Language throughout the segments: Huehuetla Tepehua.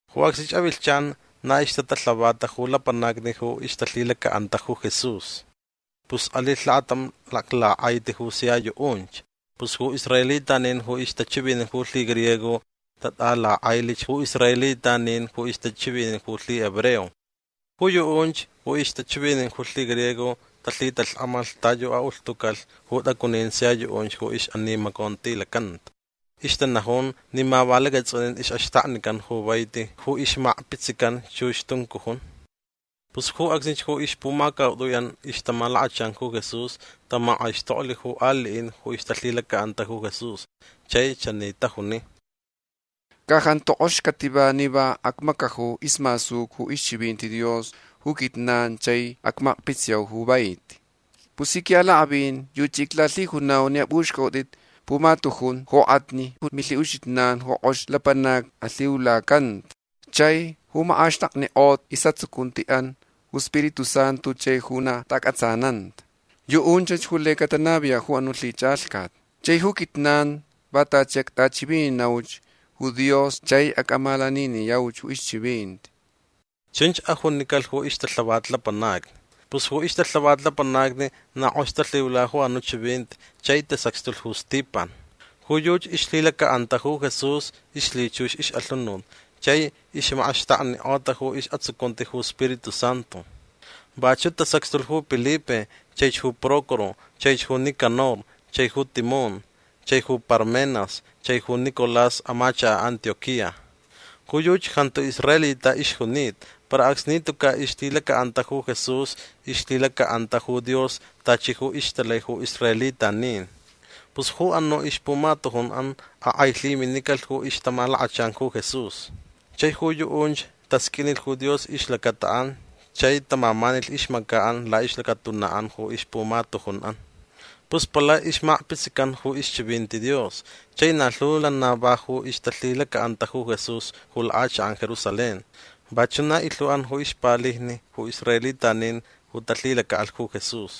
Ju acsnich avilhchan na ixtatalhavata ju lapanacni ju ixtalhilaca'anta ju Jesús. Pus alilh lakatam laklak'aiti ju sia yu'unch. Pus ju israelitanin ju ixtachivinin ju lhigriego tat'alak'ailich ju israelitanin ju ixtachivinin ju lhihebreo. Ju yu'unch ju ixtachivinin ju lhigriego talhitalhk'amalh ta yu a'ulhtucalh ju t'acunin sia yu'unch ju ix'animacontilacanta. Ixtanajun ni ma va lacats'unin ix'axtaknican ju vaiti ju ixmakpitsican chux tuncujun. Pus ju acsnich ju ixpumacaut'ui'an ixtamalakachan ju Jesús tamak'aixtoklh ju ali'in ju ixtalhilaca'anta ju Jesús chai chani tajuni: ―Ca jantu k'ox cativa ni va acmacaju ismasuca ju ixchivinti Dios ju quijnan chai acmakpitsiyau ju vaiti. Pus ji qui'alak'avin yuchi iclalhijunau ni ap'uxc'a'ut'it pumatujun jok'atni ju milhi'uxijnan ju k'ox lapanacni alhiulacanta chai ju mak'axtaknik'ota is'atsucunti'an ju Spiritu Santu chai ju na ta'ac'atsananta. Yu'unchach ju laich catanaviya' ju anu' lhich'alhcat. Chai ju quijnan va tachi act'achivininauch ju Dios chai ac'amalaniniyau ju ixchivinti. ―Chunch ajunicalh ju ixtalhavat lapanacni. Pus ju ixtalhavat lapanacni na k'ox talhiula ju anu' chivinti chai tasacxtulh ju Stipan. Ju yuchi ixlhilaca'anta ju Jesús ixlhichux ix'alhunut chai ixmak'axtaknik'ota ju is'atsucunti ju Spiritu Santu. Vachu' tasacxtulh ju Pilipe chaich ju Prócoro chaich ju Nicanor chai ju Timón chai ju Parmenas chai ju Nicolás amachaka' Antioquía. Ju yuchi jantu israelita ixjunita para acsni tuca' ixlhilaca'anta ju Jesús ixlhilaca'anta ju Dios tachi ju ixtalai ju israelitanin. Pus ju anu' ixpumatujun'an ak'ailhiminicalh ju ixtamalakachan ju Jesús. Chai ju yu'unch tasq'uinilh ju Dios ixlacata'an chai tamamanilh ixmaca'an la'ixlacatuna'an ju ixpumatujun'an. Pus palai ixmakpitsican ju ixchivinti Dios chai na lhu lana va ju ixtalhilaca'anta ju Jesús ju lak'achak'an Jerusalén. Vachu' na ilhu'an ju ixpalijni ju israelitanin ju talhilaca'alh ju Jesús.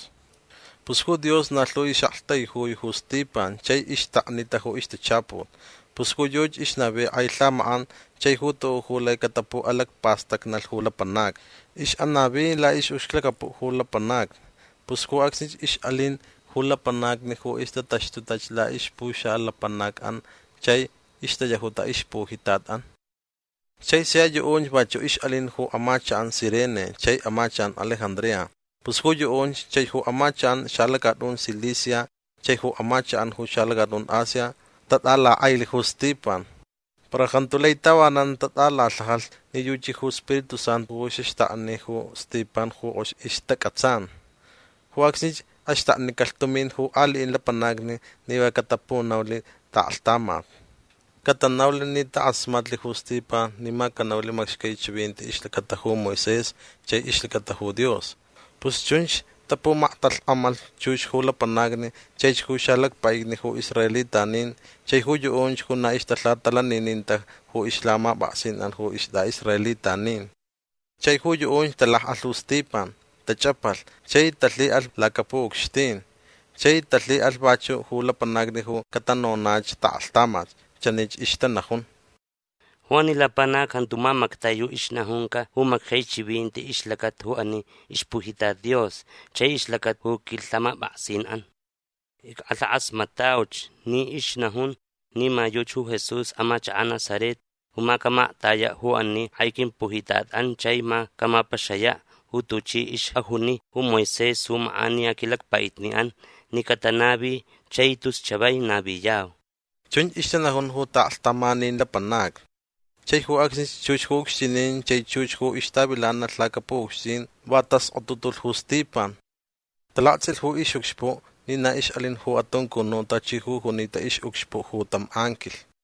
Pus ju Dios na lhu ix'aktaijui ju Stipan chai ixtaknita ju ixtachaput. Pus ju yuchi ixnavi k'ai lhamak'an chai ju tu'u' ju lai catapu'alacpastacnalh ju lapanacni. Ix'anavi la'ix'ucxlacapu'an ju lapanacni. Pus ju acsnich ix'alin ju lapanacni ju ixtataxtutach la'ixpuxalapanac'an chai ixtayajuta ixpujitat'an. Chai sia yu'unch vachu' ix'alin ju amachak'an Cirene chai amachak'an Alejandría. Pus ju yu'unch chai ju amachak'an xalacat'un Cilicia chai ju amachak'an ju xalacat'un Asia tat'alak'ailh ju Stipan. Para jantu lai tavanan tat'alalhajalh ni yuchi ju Spiritu Santu ju xaxtakni ju Stipan ju k'ox ixtac'atsan. Ju acsnich axtaknicalh tumin ju ali'in lapanacni ni va catapunaulh ta'aklhtamat. Catanaulh ni tak'asmatlh ju Stipan ni ma canaulh macxcai chivinti ixlacata ju Moisés chai ixlacata ju Dios. Pus chunch tapumaktalhk'amalh chux ju lapanacni chaich ju xalacpa'itni ju israelitanin chai ju yu'unch ju na ixtalhatalanininta ju ixlhamap'aksin'an ju ist'a'israelitanin. Chai ju yu'unch talak'alh ju Stipan. Tach'apalh chai talhi'alh lacapu'ucxtin. Chai talhi'alh vachu' ju lapanacni ju catanonach ta'aklhtamat. Chanich ixtanajun: ―Ju ani lapanac jantu mamactai ju ixnajunca ju macxcai chivinti ixlacata ju ani ixpujitat Dios chai ixlacata ju quilhamap'aksin'an. Ick'alhak'asmat'auch ni ixnajun ni ma yuchi ju Jesús amachaka' Nazaret ju ma camaktaya' ju ani k'ai quimpujitat'an chai ma camapaxaya' ju tuchi ix'ajuni ju Moisés ju mak'aniya quilacpa'itni'an ni catanavi chai tus chavai naviyau. ―Chunch ixtanajun ju ta'aklhtamanin lapanacni. Chai ju acsnich chux ju ucxtinin chai chux ju ixtavilanalh lacapu'ucxtin va taskotutulh ju Stipan. Talakts'ilh ju ix'ucxpu' ni na ix'alin ju atuncunu' tachi ju junita ix'ucxpu' ju tam anquilh.